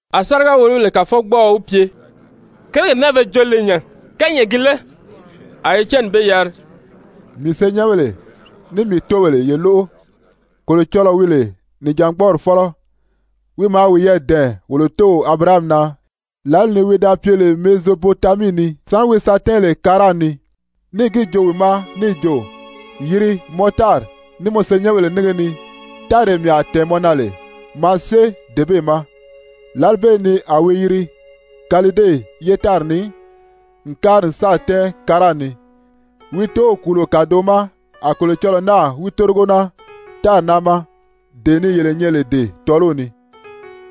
A sáriga-wòlobèle kàfɔgbɔɔɔ wi pye: «Kérigèle naa be joo lè nya, kányɛʔɛ gi lé?» A Etyɛni be yari: «Mii senyɛnbèle, ní mii tóobèle, ye lóʔo! Kolocɔlɔɔ wi lè nìjangbɔɔri fɔ́lɔ, wi maa wiyɛɛ dɛ̀ɛn wolo tóow Abirahami na lǎli ni wi da pye lè Mezopotamii ni, sáni wi sa tɛ́ɛn lè Karan ni. Níì gi joo wi ma níì jo: ‹Yiri mɔ tári, ní mɔ senyɛnbèle nínge ni, táree mii a tɛ̀ɛn mɔ na lè maa syée dee bee ma.› Lǎli bee ni a wi yiri Kalide ye tári ni n kári n sáà tɛ́ɛn Karan ni. Wi tóow kùulo kàdoʔo ma a Kolocɔlɔɔ náà wi tórigo naa tári naa ma, dee ni yele nyɛ lè dee tɔ́ɔliw ni.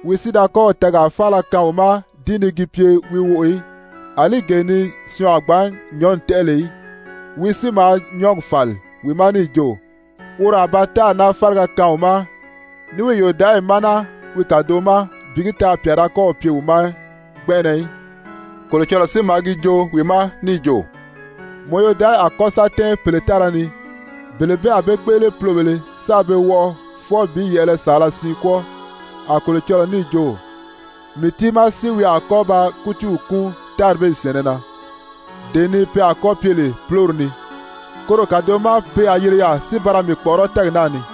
Wi si da kɔ́ɔ̀ tɛɛgaa faala kaan wi ma di ni gi pye wi woʔò í, àlí gee ni syɔɔn a gbǎn nyɔ̌nni tɛ́ʔɛ lè í, wi si maa nyɔ́ɔgi fàli wi ma níì jo, woro a ba tári naa fáliga kaan wi ma ní wi yòdaʔayi ma naa wi kàdoʔo ma bi gi taa pyà da kɔ́ɔ̀ pye wi ma gbɛnʔɛnɛ í. Kolocɔlɔɔ si maa gi joo wi ma níì jo: ‹Mɔ yodaʔayi a kɔ́ sa tɛ́ɛn pèle tára ni. Bele bee a be kpéʔele pulobèlē sáā be wɔʔɔ fwɔɔ bi yɛ̀ʔɛlɛ saala siin kwɔ́ɔ.› A Kolocɔlɔɔ níì jo: ‹Mii tiimaa si wi a kɔ́ ba kútiiw kúun tári bee syɛ̀ɛnnɛ na, dee ni pe a kɔ́ pye lè púlori ni. Koro kàdoʔo ma pe a yiri yaà si ba ra mii kpɔ̀ʔɔrɔ́ tɛ́ɛgi naa ni.›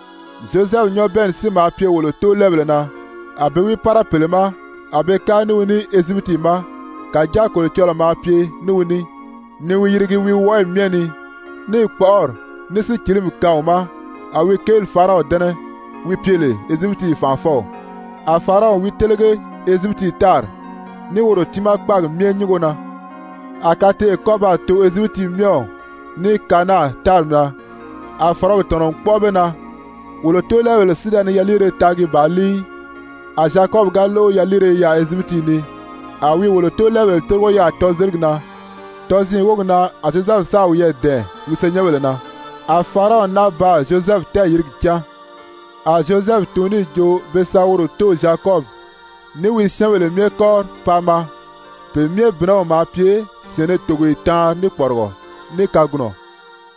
Zyozɛfu nyabɛɛnni si maa pye wolo tóolɛɛbèle na, a be wi pára pèle ma, a be kári ní wi ní Ezyipiti ma. Kàjáa Kolocɔlɔɔ maa pye ní wi ní ni wi yirigi wi wɔʔɔyi myɛ ni, níì kpɔ́ʔɔri, ní sícilimi kaan wi ma, a wi kéeli Faraɔnw dɛ́nɛ, wi pye lè Ezyipiti fànʔafɔw, a Faraɔn wi télege Ezyipiti tári, ní woro tiimaa kpáagi myɛ nyúngo na. A kateʔe kɔ́ baa too Ezyipiti myɛw, ní Kanaan tári na. A fɔ̀rɔgi tɔ̀nɔ n kpɔ́ʔɔ be na. Wolo tóolɛɛbèle si da ni yaliire taagi bàā líi í. A Zyakɔbi ga lóʔo yaliire i yaà Ezyipiti ni, a wi wolo tóolɛɛbèle tórigo yaà tɔzeligi na. Tɔziin wógi na a Zyozɛfu sáà wiyɛɛ dɛ̀ɛn wi senyɛnbèle na, a Faraɔn náa baa Zyozɛfu tɛɛyìrigi cán. A Zyozɛfu tun níì jo pe sa woro tóow Zyakɔbi, ní wi syɛ́ɛnbèle myɛ kɔ́ri paa maa, pe myɛ bìnɛw maa pye syɛ̀ɛnnɛ togoye taanri ní kpɔrigɔ ní kagunɔ.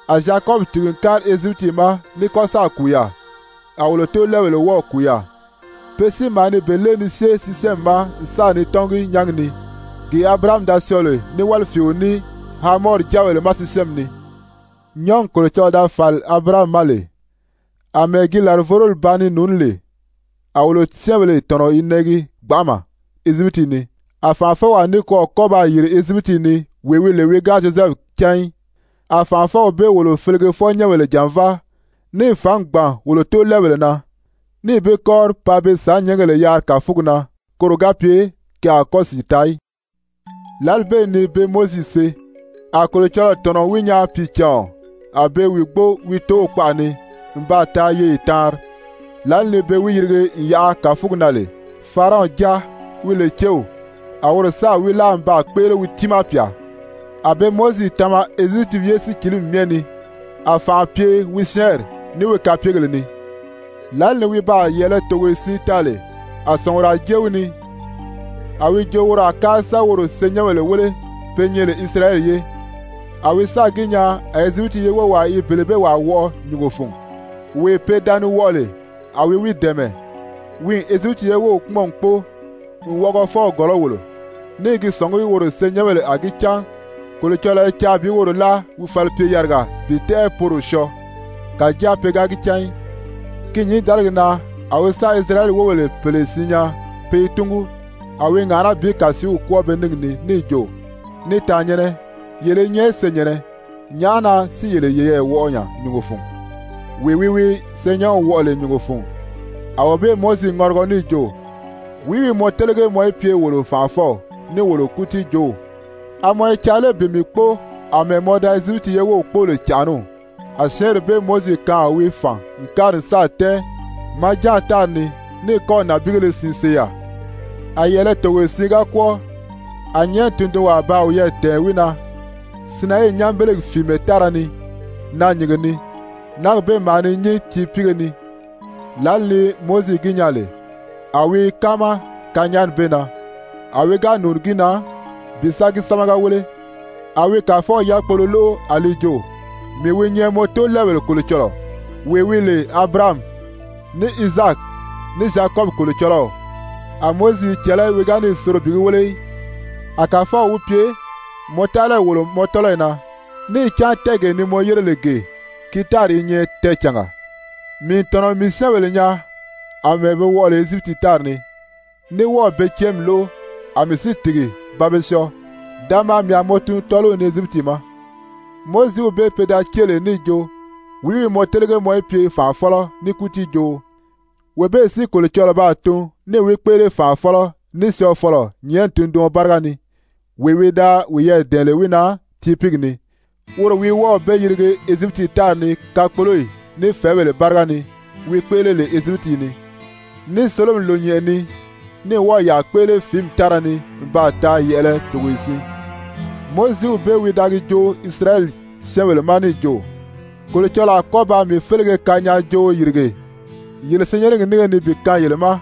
A Zyakɔbi tìgi n kári Ezyipiti ma ní kɔ́ sáà kùu yaà, a wolo tóolɛɛbèle wɔ́ɔ̀ kùu yaà. Pe si maa ni be lée ni syée Sisyɛmi ma n sa ni tɔ́ngi nyángi ni, gee Abirahami da syɔɔ lè ní wálifiio ní Hamɔri jáabèle ma Sisyɛmi ni. Nyɔ́ɔgi Kolocɔlɔɔ da fàli Abirahami ma lè, àmɛɛ gi làrivoroli ba ni nùuní lè, a wolo syɛ́ɛnbèle tɔ̀nɔ i nɛʔɛgi gbanʔama Ezyipiti ni. A fànʔafɔwaa nikwɔɔ kɔ́ baa yìri Ezyipiti ni wee wi lè wi ga Zyozɛfu cán í. A fànʔafɔw bee wolo felegefɔ-nyɛ́nbèle jànváa, níì fǎngi gbàn wolo tóolɛɛbèle na, níì be kɔ́ri paa be sàánnyɛɛngèle yaari kàfugi na koro ga pye ke a kɔ́ sìi taa í. Lǎli bee ni be Mowizi see, a Kolocɔlɔɔ tɔ̀nɔ n wi nyaa pìicàɔn. A be i wi gbóo wi tóow kpaʔa ni n baa taa yeye taanri. Lǎli ni be wi yirige n yaʔa kàfugi na lè, Faraɔnw jáa, wi lè céw, a woro sáà wi láa n baa kpéʔele wi tiimaa pyà. A be Mowizi tama Ezyipiti ye sícilimi myɛ ni, a fànʔa pye wi syɛ́ɛnri, ní wi kapyegèle ni. Lǎli ni wi baa yɛ̀ʔɛlɛ togoye siin taa lè, a sɔ̀nguraa jée wi ni, a wi jo woro a kári sa woro senyɛnbèle wéle pe nyɛ lè Isirayɛli ye. A wi sáà gi nyaa a Ezyipiti ye wówaa i bele bee wàa wɔʔɔ nyùngo fun, wee pe da ni wɔʔɔ lè, a wi wi dɛ̀ɛmɛ, wi n Ezyipiti ye wów kpúmɔn n kpóo n wɔʔɔgɔfɔw gɔ̀lɔ́ wòlo, ní i gi sɔ̀ngí woro senyɛnbèle a gi cán Kolocɔlɔɔ i caa bi woro láa wi falipye-yariga bi tɛ́ʔɛ poro syɔɔ. Kàjáa pe ga gi cán í. Ki nyǐndaligi na a wi sáà Isirayɛli wóbèle pèle siin nyaa pe i túngu. A wi i ŋàʔaná bi kàsiiw kwɔ́ɔ be níngi ni níì jo: ‹Ni tàannyɛ̀nnɛ, yele i nyɛ senyɛ̀nnɛ, nyàʔá na si yele yeyɛɛ wɔʔɔ nya nyùngo fun?› Wee wi wi syɛɛnnyɛnw wɔʔɔ lè nyùngo fun, a wee bee Mowizi ŋɔrigɔ níì jo: ‹Wìí wi mɔ télege mɔ í pye wolo fànʔafɔw ní wolo kútiijoow? A mɔ i caa lé bi mii kpóo àmɛɛ mɔ da Ezyipiti ye wów kpóo lè cànʔaniw?› A syɛ́ɛnri bee Mowizi kaan a wi fàn n kári n sáà tɛ́ɛn Madyan tári ni, ní kɔ́ɔ̀ nànbiigéle siin see yaà. A yɛ̀ʔɛlɛ togoye siin ga kwɔ́ɔ, a nyɛ̀ʔɛni tundunwaa baa wiyɛɛ dɛ̀ɛn wi na Sinayii nyanbelegi fìimɛ tára ni naanyìnge ni. Náagi bee maa ni nyín tiipiige ni. Lǎli ni Mowizi gi nyaa lè, a wi i káama kanyaani bee na, a wi ga nùuni gi na bi sa gi sámaga wéle, a wi Kàfɔw yákpolo lóʔo a li jo: ‹Mii wi nyɛ mɔ tóolɛɛbèle Kolocɔlɔɔ, wee wi lè Abirahami, ní Izaaki, ní Zyakɔbi Kolocɔlɔw.› A Mowizi i cɛ̀lɛ́, wi ga níì soro bi gi wéle í. A Kàfɔw wi pye: ‹Mɔ taʔalayi wòlo mɔ tɔ́lɔyi na, níì cán tɛ́ɛgee ni mɔ yére lè gee, ki tári i nyɛ tɛɛcànga. Mii n tɔ̀nɔ n mii syɛ́ɛnbèle nyaa àmɛɛ be wɔʔɔ lè Ezyipiti tári ni, ní wɔ́ɔ̀ be cɛ́ɛnmi lóʔo, a mii si tìgi ba be syɔɔ. Da maa mii a mɔ tun tɔ́ɔliw ni Ezyipiti ma.› Mowiziw bee pe da cée lè níì jo: ‹Wìí wi mɔ télege mɔ í pye fànʔafɔlɔ ní kútiijooo?› Wee bee si Kolocɔlɔɔ baa tun níì wi kpéʔele fànʔafɔlɔ ní syɔɔfɔlɔ nyɛ̀ʔɛni tunduɔn báriga ni, wee wi da wiyɛɛ dɛ̀ɛn lè wi na tiipiigi ni. Woro wi wɔ́ɔ̀ be yirige Ezyipiti tári ni kakpoloyi ní fɛ̀ɛ́bèle báriga ni wi kpéʔele lè Ezyipiti ni, ní Sólomi Lònyɛnʔɛ ni, ní wɔ́ɔ̀ yàa kpéʔele fìími tára ni n baa taa yɛ̀ʔɛlɛ togoye siin. Mowiziw bee wi da gi joo Isirayɛli syɛ́ɛnbèle ma níì jo: ‹Kolocɔlɔɔ a kɔ́ ba mii félege kanyaajooo yìrige yele senyɛnnɛgi nínge ni bi kaan yele ma.›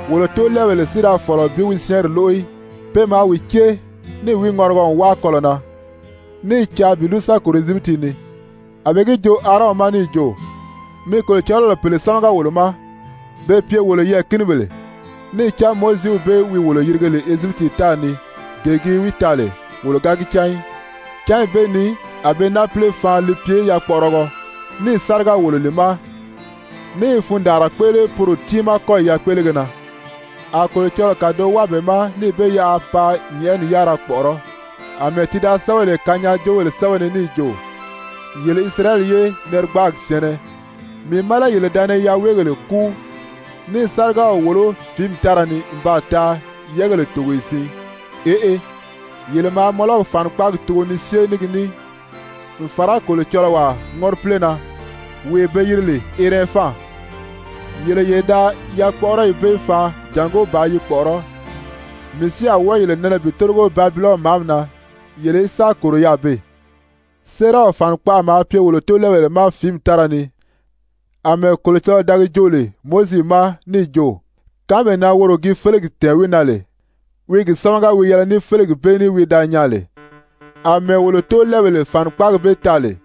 Wolo tóolɛɛbèle si da fɔ̀lɔ bi wi syɛ́ɛnri lóʔo í, pe maa wi cée níì wi ŋɔrigɔ n wáa kɔlɔ̀ na, ní i caa bi lúru sa kòro Ezyipiti ni. A be gi joo Aarɔn ma níì jo: ‹Mi kolocɔlɔbèle pèle sámaga wolo ma be pye wolo yɛɛ̀kinibèle. Níì cán Mowiziw bee wi wolo yirige lè Ezyipiti tári ni, gee gi wi taa lè, wolo ga gi cán í.› Cányi bee ni a be náapile faan li pye yakpɔʔɔrɔgɔ, níì sáriga wòlo li ma, ní i fundaanra kpéʔele poro tiimaa kɔ́yi yakpéʔelege na. A Kolocɔlɔɔ kàdoʔo wáa be ma níì be yaʔa paa nyɛ̀ʔɛni yárira kpɔ̀ʔɔrɔ́, àmɛɛ ti da sɛ́bɛ lè kanyaajoobèle sɛ́bɛ ni níì jo: ‹Yele Isirayɛli ye narigbaagi syɛ̀ɛnnɛ, mii má lé yele da ni yaweegèle kúu, ní i sárigaw wòló fìími tára ni n baa taa yɛ́ɛgèle togoye siin? Eʔe, yele maa Mɔlɔki fànikpaagi tugo ni syée ní gi ní, n fàra kolocɔlɔwaa ŋɔ́ripile na, wee be yiri lè Ɛrɛnfan, yele ye da yakpɔʔɔrɔyi bee faan jàngó bàā yi kpɔ̀ʔɔrɔ́! Mii si a wɔ́ɔ yele nɛnɛ bi tórigo Babilɔni màʔami na, yele í sa kòro yaà beè.› Séeraw fànikpaʔa maa pye wolo tóolɛɛbèle ma fìími tára ni, àmɛɛ Kolocɔlɔɔ da gi joo lè Mowizi ma níì jo, kánmee na woro gi félegi tɛ̀ɛn wi na lè, wi gi sámaga wi yɛlɛ ní félegi bee ní wi da nyaa lè. Amɛɛ wolo tóolɛɛbèle fànikpaagi bee taa lè,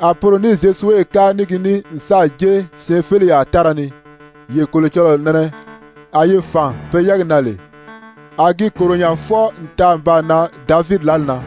a poro ní Zyozuwe kári ní gi ní n sáà jée syɛɛnfeleyaa tára ni, yee Kolocɔlɔɔ nɛnɛ a yi fàn pe yɛ́ɛgi na lè. A gi kòro nya fwɔɔ n taa n baa nan Davidi lǎli na.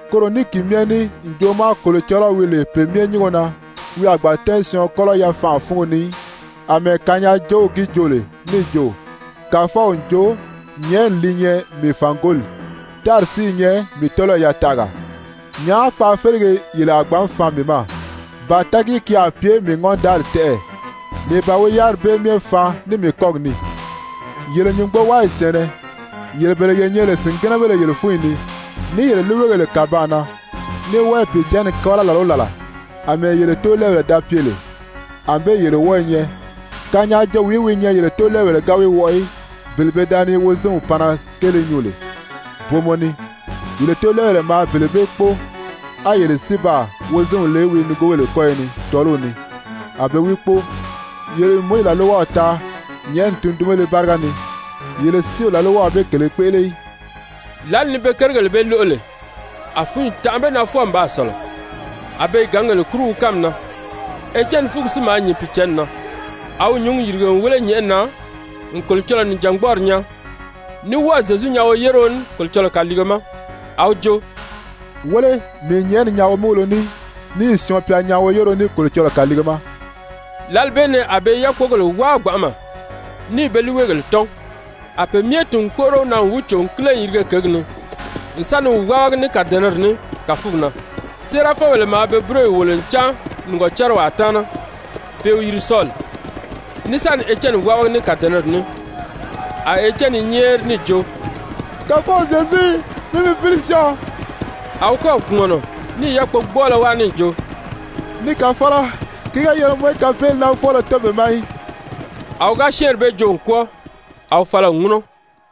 Koro ní ki myɛ ní ǹjoʔo ma Kolocɔlɔw wi lè pe myɛ nyúngo na, wi a gbǎn tɛ́ɛn syɔɔn kɔ́lɔ yafanʔa fúngo ni í, àmɛɛ kanyaajoow gi joo lè níì jo: ‹Kàfɔw n jo: Nyɛ̀ʔɛni li nyɛ mii fàngoli, tári si i nyɛ mii tɔ́lɔyi yataʔaga. Nyàʔá kpaafelege yele a gbǎn faan mii ma, ba tɛɛgìí ki a pye mii ŋɔ́ndaali tɛ́ʔɛ? Mii ban wi yáriri bee myɛ faan ní mii kɔ́gi ní ì?› Yele nyùngbowaayi syɛ̀ɛnnɛ, yele bele ye nyɛ lè sìngɛnɛbéle yele fúnyi ni, ní yele líiweegèle kàbaan na, ní wɔ́ɔ i Pìicǎnni kábala làla o làla, àmɛɛ yele tóolɛɛbèle da pye lè, ànbée yele wɔ́ɔ̄ nyɛ. Kanyaajoowìí wi nyɛ yele tóolɛɛbèle ga wi wɔʔɔ í? Bele pe da ni Wozinw panna kéele nyuu lè booma ni, yele tóolɛɛbèle maa bele bee kpóo, á yele si baa Wozinw le wi nigoobèle kɔ́yɔ ni tɔ́ɔliw ni a be wi kpóo. Yele n Mowizi làlwaw taa nyɛ̀ʔɛni tundunbéle báriga ni, yele si o làlwaw bee kèlē kpéʔele í.» Lǎli ni be kérigèle bee lóʔo lè, a fúnyi tanʔa be na fwɔɔ n baa sɔ̀lɔ, a be i gǎngèle kúru wi kánmi na. Etyɛni fúngi si maa nyìn Pìicǎnni na, a wi nyǔngi yìrige n wéle nyɛ̀ʔɛni na n Kolocɔlɔɔ nìjangbɔɔri nyaa, ní wɔ́ɔ̀ Zyezu nyaa woyéreo ní Kolocɔlɔɔ kàliige ma. A wi jo: «Wéle, mii n nyɛ̀ʔɛni nyaa womúgulo ní, níì Syɔɔn-pya nyaa woyéreo ní Kolocɔlɔɔ kàliige ma.» Lǎli bee ni a be i yákpogèle wáa gbanʔama, níì be líiweegèle tɔ́n, a pe myɛ tìn n kpóʔoro wi na n wi cò n kíle n yirige kěgi ni, n sa ni wi wábagi ní kàdɛnɛri ní kàfugi na. Séerafɔbèle maa be búroyi wòlo n cáan nìgɔcariwaa taana, pe i wi yiri Sɔli, ní sa ni Etyɛni wábagi ní kàdɛnɛri ní, a Etyɛni i nyɛ́ɛri níì jo: «Kàfɔw Zyezu, mi mii pǐli syɔɔ!» A wi kɔ́ɔ̀ kpùmɔnɔ níì yákpogbɔɔlɔ wáa níì jo: «Ni Kàfɔlɔ, ki ga yɛlɛ mɔ í kapeeli naa fwɔ́ɔlɔ tɔ́n be ma í.» A wi ga syɛ́ɛnri bee joo n kwɔ́ɔ, a wi fala n ŋúnɔ.